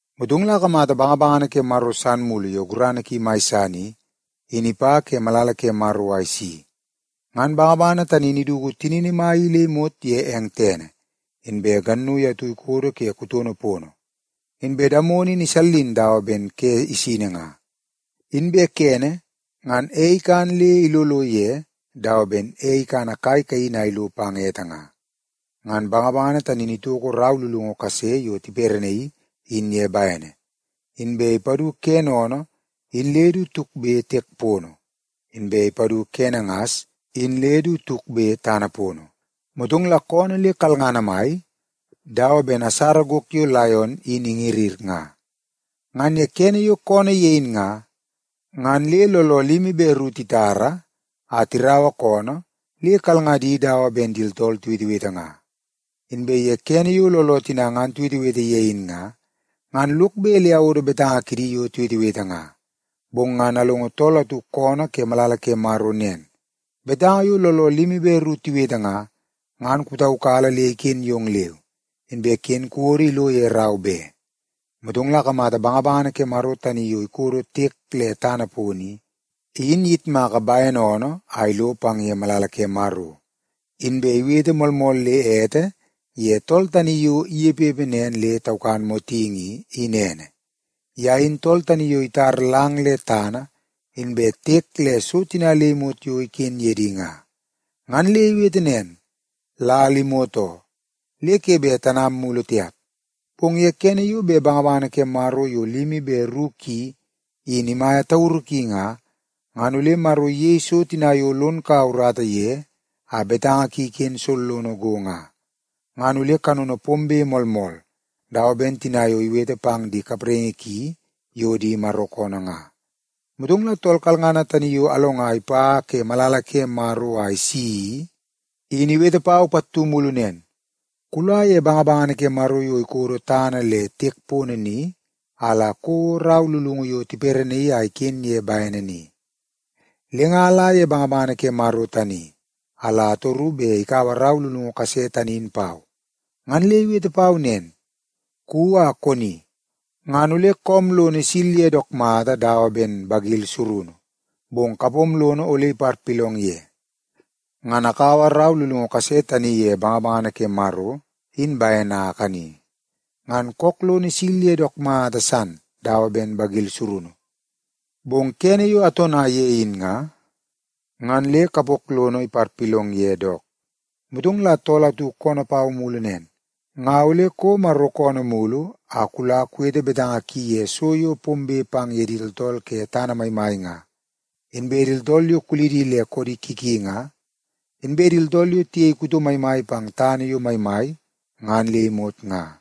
Motong la akamata bangabangana ke Maro san mulu yo gurana ki mai san i, in ipa ke malala ke Maro a isi. Ngan bangabangana tani in iduku tinini mai i le imot ye eng tene, inbe gannui atu ikodo ke kutono pono. Inbe damono in isallin dawa ben ke isini nga. Inbe kene, ngan ei ikan le ilolo ye dawa ben ei ikana kai kaini a ilo pang ete nga. Ngan bangabangana tani in itoko rau lulungu kase yo tiperenaii in ye bene, inbe ipadu kene oonoo in le du tukbe tiek pono, inbe ipadu kene ngas in le du tukbe tana pono. Motong la koonoo le kalngana mai dawa ben asara gok yo laion in ingirngir nga. Ngan ye kene yo koonoo ye in nga, ngan le looloo limi be ru titara a tiraua koonoo le kalngadi dawa ben di tooltool tiwetewete nga. Inbe ye kene yo looloo tina ngan tiwetewete ye in nga, ngan lok bet le awodo betanga kidi yo tiwetewete nga. Bong ngan alongo tool atu koonoo ke malala ke Maro nen, “Betanga yo looloo limi be ru tiwete nga, ngan kupataukala le iken yong leu, inbe ken kuwodo ilo ye rau be.” Motong la akamata bangabangana ke Maro tani yo ikodo tiek le tana pono i, in iyitmaka bene oonoo a ilo pang ye malala ke Maro. Inbe iwete moolmool le ete ye tool tani yo inepepe nen le taukan motingi i, in ene. Ye in tool tani yo itar lang le tana inbe tiek le so tina le imot yo iken ye di nga. Ngan le iwete nen, “Lal imot oo, le ke bet tanam mulu tiap! Bong ye kene yo bet bangabangana ke Maro yo limi be ru ki i, in imaia tauru ki nga, ngan ole Maro iyei so tina yo lon kaua urata ye a betanga ki iken sollono go nga. Ngan ole kanono pombe moolmool dawa ben tina yo iwete pang di kapraingi ki yo di Maro koonoo nga.” Motong la tool kalngana tani yo alonga ipa ke malala ke Maro a isi i, in iwete pau pattu mulu nen, “Kula ye bangabangana ke Maro yo ikodo tana le tiek pono ni a la kouo rau lulungu yo tiperenaii a iken ye bene ni.” Le nga ala ye bangabangana ke Maro tani a la atoru bet ikaua rau lulungu kase tani in pau. Ngan le iwete pau nen, “Kuwi a koni, ngan ole koom lono isil ye dook mata dawa ben bagil surunu, bong kapom lono ole iparpilong ye.” Ngan akaua rau lulungu kase tani ye bangabangana ke Maro in bene a akani, ngan kook lono isil ye dook mata san dawa ben bagil surunu. Bong kene yo atona ye in nga, ngan le kapok lono iparpilong ye dook. Motong la tool atu koonoo pau mulu nen, “Nga ole kouo Maro koonoo mulu a la kuwete betanga ki ye so yo bet pombe pang ye di tooltool ke tana maimai nga, inbe di tooltool yo kulidi le koodi ki ki nga, inbe di tooltool yo tiyei kuto maimai pang tana yo maimai ngan le imot nga.”